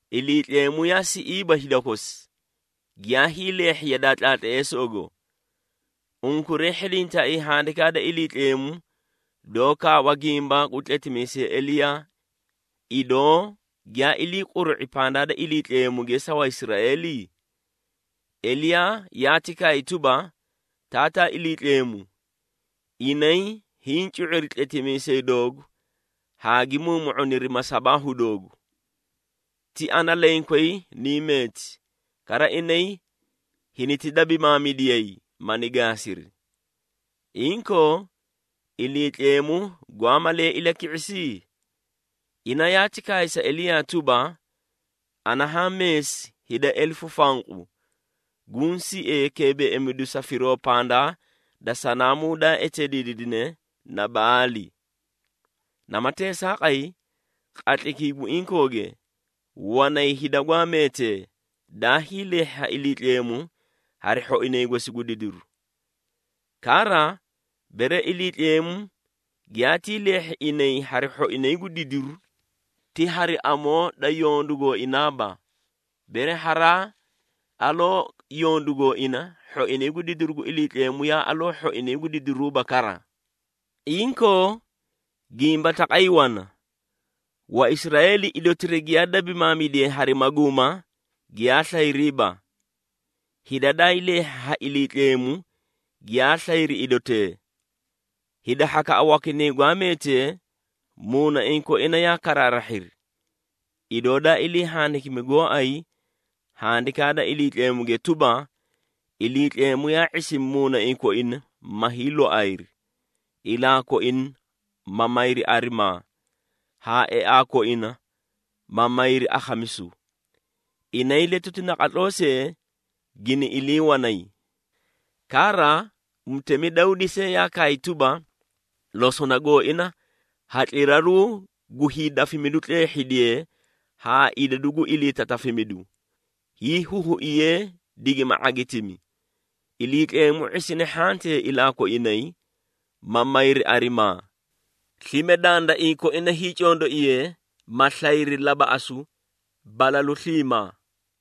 Iliitleemu yaa siꞌiiba hida kosi, giyaa hiileehhi yadaa tlaatleesoogo. Unkuray hhidintaaii Handikaa da Iliitleemu doó kaawa gimba gu tletimiisay Eliyaa, idoo giyaa ilii quru⁄i pandaa da Iliitleemuge sa Waisraeeli? Eliyaa yaati kaay tuba, “Taataa Iliitleemu, inay hiĩ cu⁄iri tletimiisee doogu haa gi muumu⁄uniri masabaahu doogu. Ti ana lenkway niĩ meeti, kara inay hiniti dabimaamidiyay, mani gaasiri.” Inkoo, Iliitleemu gwaa malee ilaki⁄isi? Ina yaati kaay sa Eliyaa tuba, “Ana haã meesi hida elefu fanqu, guũ siee keebeeimidu sa firoo pandaa da sanaamuu daa eteediidine na Baali.” Nama teesaaqay, qatlaykii gu inkooge, wanay hida gwaa meetee, daa hiileehhi ha Iliitleemu hari hhoinay gosi gu didiru. Kara, bere Iliitleemu giyaatii leehhi inay hari hhoinay gu didiru, ti hari amoo da yondu gooinaaba. Bere haraa aloo yondu gooina, hhoinay gu didiru gu Iliitleemu yaa aloo hhoinay gu didiruuba kara. Inkoo, gimba taqay wana. Waisraeeli idotira giyaa dabimaamidiye hari maguuma, giyaa slayriiba. Hida daa hiileehhi ha Iliitleemu, giyaa slayri idotee. Hida hhakaꞌa wakinay gwaa meetee, muunaiĩ koina yaa karaarahhiri. Idoo daa ilii handikimi gooay Handikaa da Iliitleemuge tuba, “Iliitleemu yaa ⁄isimi muunaiĩ koina, ma hiiloayri, ilaa koina, ma mayri arimaa, haa eaa koina, ma mayri akhamisu. Inay letuti naqatloo see gini ilii wanay.” Kara, mutemi Dawdi see yaa kaay tuba, “Losona gooina hatliraruu gu hiidafimidu tleehhidiyee ha idadu gu iliitatafimidu, hiihuhuiyee, digima ⁄agitimi. Iliitleemu ⁄isine hhantee ilaa koinay, ma mayri arimaa. Slime dandaiĩ koina hiicondoiyee, ma slayri labaꞌasu balalu sliimaa.”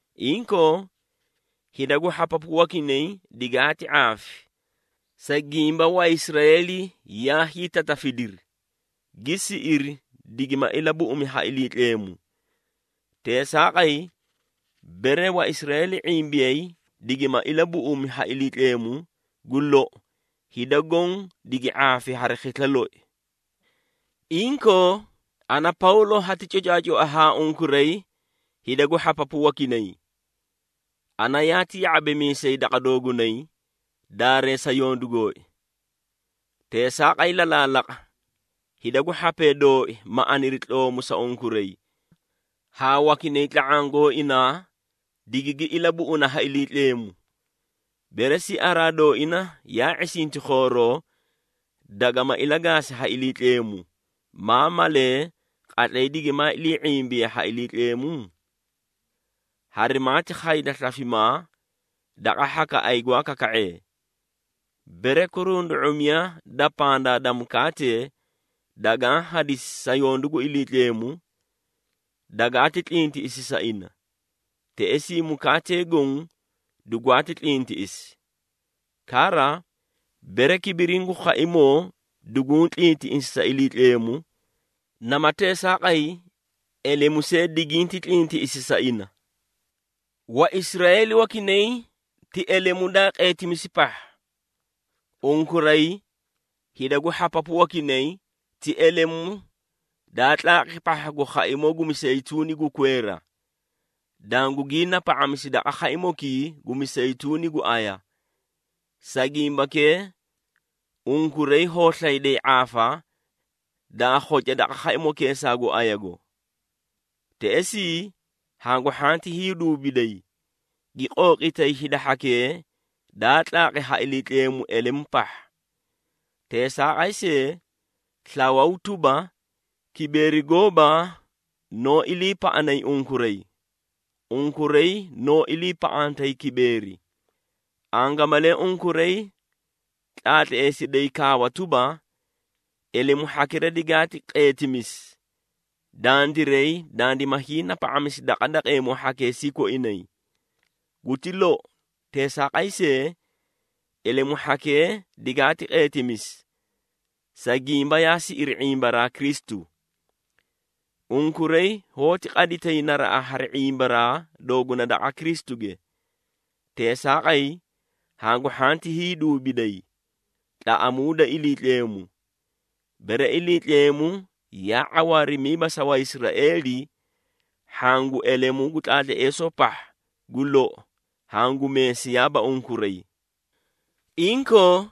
Inkoo, hida gu hhapapu wakinay digaati ⁄aafi, sa gimba Waisraeeli yaa hiitatafidiri, gi siꞌiri digima ilabuꞌumi ha Iliitleemu. Teesaaqay, bere Waisraeeli ⁄imbiyay digima ilabuꞌumi ha Iliitleemu, gu lou hida goõ digi ⁄aafi hari khisla loi! Inkoo, ana Pawlo hati cocaacoa haa unkuray hida gu hhapapu wakinay. Ana yaati ya⁄abimiisay daqa doogunay, daareesa yondu gooi. Teesaaqay lalaalaqa, hida gu hhapee dooi, ma aniri tloomu sa unkuray, haa wakinay tla⁄aã gooinaa digigi ilabuꞌuna ha Iliitleemu. Bere siaraa dooina yaa ⁄isinti khooroo, dagama ilagaasi ha Iliitleemu, maa malee, qatlay digimaa ilii ⁄imbiye ha Iliitleemu? Harimaati khayda slafimaa daqa hhakaꞌay gwaa kaka⁄ee. Bere kurundu⁄umiya da pandaa da mukaatee, dagaã hadisi sa yondu gu Iliitleemu, dagaati tlintiꞌisi sa ina, teꞌesii mukaatee goõ dugwaati tlintiꞌisi. Kara, bere kibiriĩ gu khaimoo duguũ tlintiꞌisi sa Iliitleemu, nama teesaaqay elemu see diginti tlintiꞌisi sa ina. Waisraeeli wakinay ti elemu daa qeetimisi pahha. Unkuray, hida gu hhapapu wakinay ti elemu daa tlaaqi pahha gu khaimoo gu miseyituuni gu kweera, dangugii napa⁄amisi daqa khaimokii gu miseyituuni gu aya. Sa gimbakee, unkuray hoó slayday ⁄aafa daa khoca daqa khaimokeesaa gu ayago. Teꞌesii, hangu hhanti hiiduubiday, gi qooqitay hida hhakee daa tlaaqi ha Iliitleemu elemu pahha. Teesaaqay see, slawaw tuba, kibeeri gooba noó iliipaꞌanay unkuray, unkuray noó iliipaꞌantay kibeeri. Angamalee unkuray tlaatleesiday kaawa tuba, “Elemu hhakira digaati qeetimisi, dandiray dandima hiinapa⁄asi daqa daqeemoo hhakeesii koinay.” Guti lou! Teesaaqay see, elemu hhakee digaati qeetimisi, sa gimba yaa siꞌiri ⁄imbaraa Kristu. Unkuray hoóti qaditay naraꞌa hari ⁄imbaraa dooguna daqa Kristuge. Teesaaqay, hangu hhanti hiiduubiday. Tlaꞌamuuda Iliitleemu. Bere Iliitleemu yaa ⁄awaarimiiba sa Waisraeeli, hhaã gu elemu gu tlaatleesoo pahha, gu lou hangu meesiyaaba unkuray. Inkoo,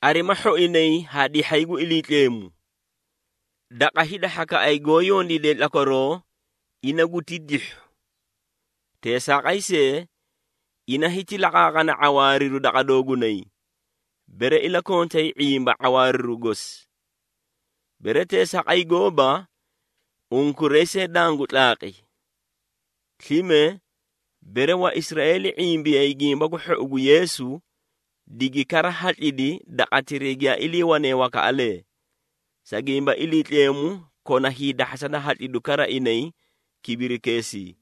arima hhoinay haa dihhay gu Iliitleemu. Daqa hida hhakaꞌay goó yondiidee tlakwaroo, ina guti dihhu. Teesaaqay see, ina hiti laqaaqana ⁄awaariru daqa doogunay, bere ilakontay ⁄imba ⁄awaariru gosi. Bere teesaaqay gooba, unkuray see dangu tlaaqi. Slime, bere Waisraeeli ⁄imbiyay Gimba gu Hhou gu Yeesu, digi kara hatlidi daqatiray giyaa iliiwane wakaꞌalee, sa gimba Iliitleemu kona hiidahhasa da hatlidu kara inay kibirikeesii.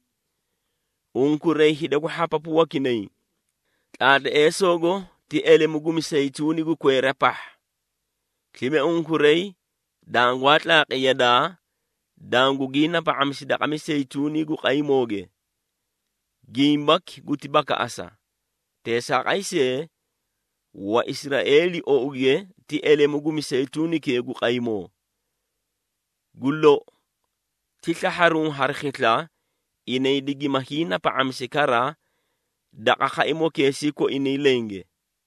Unkuray hida gu hhapapu wakinay, tlaatleesoogo ti elemu gu miseyituuni gu kweera pahha. Slime unkuray dangwaa tlaaqi yadaa, dangugii napa⁄amisi daqa miseyituuni gu qaymooge. Gimbaki guti bakaꞌasa. Teesaaqay see, Waisraeeli ouge ti elemu gu miseyituunikee gu qaymoo. Gu lou, ti slahharuũ hari khisla, inay digima hiinapa⁄amisi kara daqa khaimokeesii koinay lenge.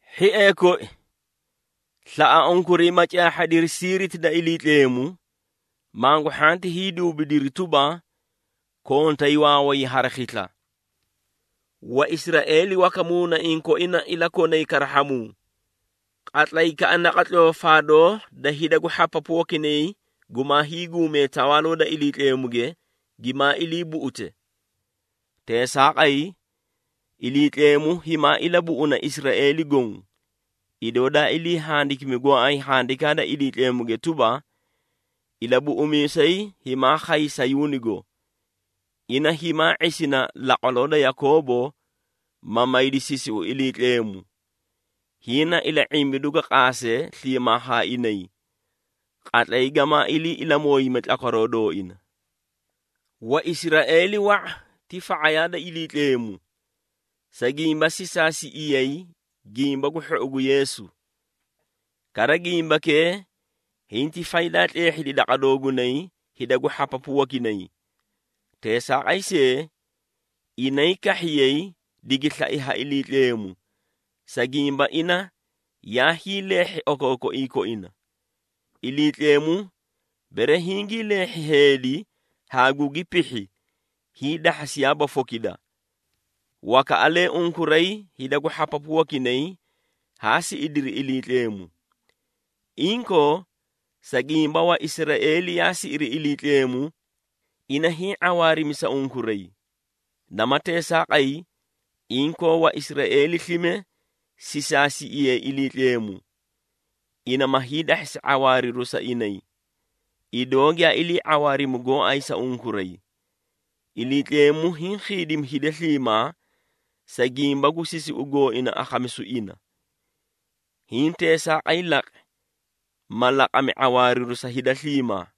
Hhiee koi, slaꞌa unkuray, ma caahhadiri siiriti da Iliitleemu, mangu hhanti hiiduubidiri tuba, kontay waaway hari khisla. Waisraeeli waka muunaiĩ koina ilakonay karahhamuu, qatlaykaꞌa naqatloo faadoo da hida gu hhapapu wakinay gumaa hiiguume Tawaaloo da Iliitleemuge, gimaa ilii buꞌute. Teesaaqay, Iliitleemu himaa ilabuꞌuna Israeeli goõ, idoo daa ilii handikimi gooay Handikaa da Iliitleemuge tuba, “Ilabuꞌumiisay himaa khay Sayuunigo, ina himaa ⁄isina laqwaloo da Yakoobo, ma maydi sisiu Iliitleemu. Hiĩ na ila⁄imbidu ga qaase sliimaa haa inay, qatlay gamaa ilii ilamooyime tlakwaroo dooina.” Waisraeeli wa⁄a ti fa⁄ayaa da Iliitleemu, sa gimba sisaasiꞌiyay Gimba gu Hhou gu Yeesu. Kara, gimbakee hinti faydaa tleehhidi daqa doogunay hida gu hhapapu wakinay. Teesaaqay see, inay kahhiyay digi slai ha Iliitleemu, sa gimba ina yaa hiileehhi okookoiĩ koina. Iliitleemu bere hingii leehhi heedi haa gugi pihhi, hiidahhasiyaaba fokida. Wakaꞌalee unkuray, hida gu hhapapu wakinay haa siꞌidiri Iliitleemu. Inkoo, sa gimba Waisraeeli yaa siꞌiri Iliitleemu, ina hiĩ ⁄awaarimi sa unkuray. Nama teesaaqay, inkoo Waisraeeli slime sisaasiꞌiyay Iliitleemu, ina ma hiidahhasi ⁄awaariru sa inay, idoo giyaa ilii ⁄awaarimi gooay sa unkuray. Iliitleemu hiĩ khiidimi hida sliimaa, sa gimba gu sisiu gooina akhamisu ina. Hiĩ teesaaqay laqi, ma laqami ⁄awaariru sa hida sliimaa.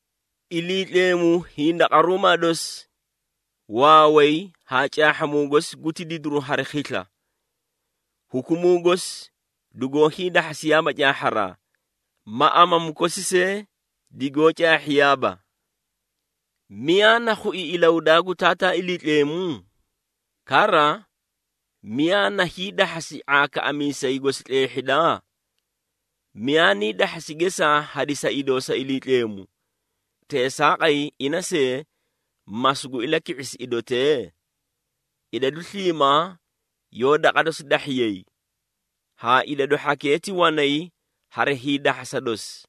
Iliitleemu hindaqaruumaa dosi, waaway haa caahhamuu gosi guti didiri hari khisla! Hukumuu gosi dugoó hiidahhasiyaaba caahharaa, ma amamu kosi see digoó caahhiyaaba. “Miyaa na khui ilahudaa gu Taataa Iliitleemu? Kara, miyaa na hiidahhasi ⁄aakaꞌamiisay gosi tleehhida?” “Miyaa nii dahhasi gesaa hadisa idoo sa Iliitleemu, teesaaqay ina see, ma sugu ilaki⁄isi idotee?” Idadu sliimaa yoó daqa dosi dahhiyay, haa idadu hhakee ti wanay hari hiidahhasa dosi,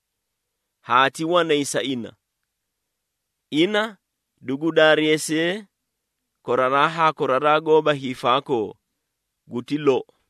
haa ti wanay sa ina. Ina dugu daareesiye koraraa haa koraraa gooba hiifaakoo! Guti lou.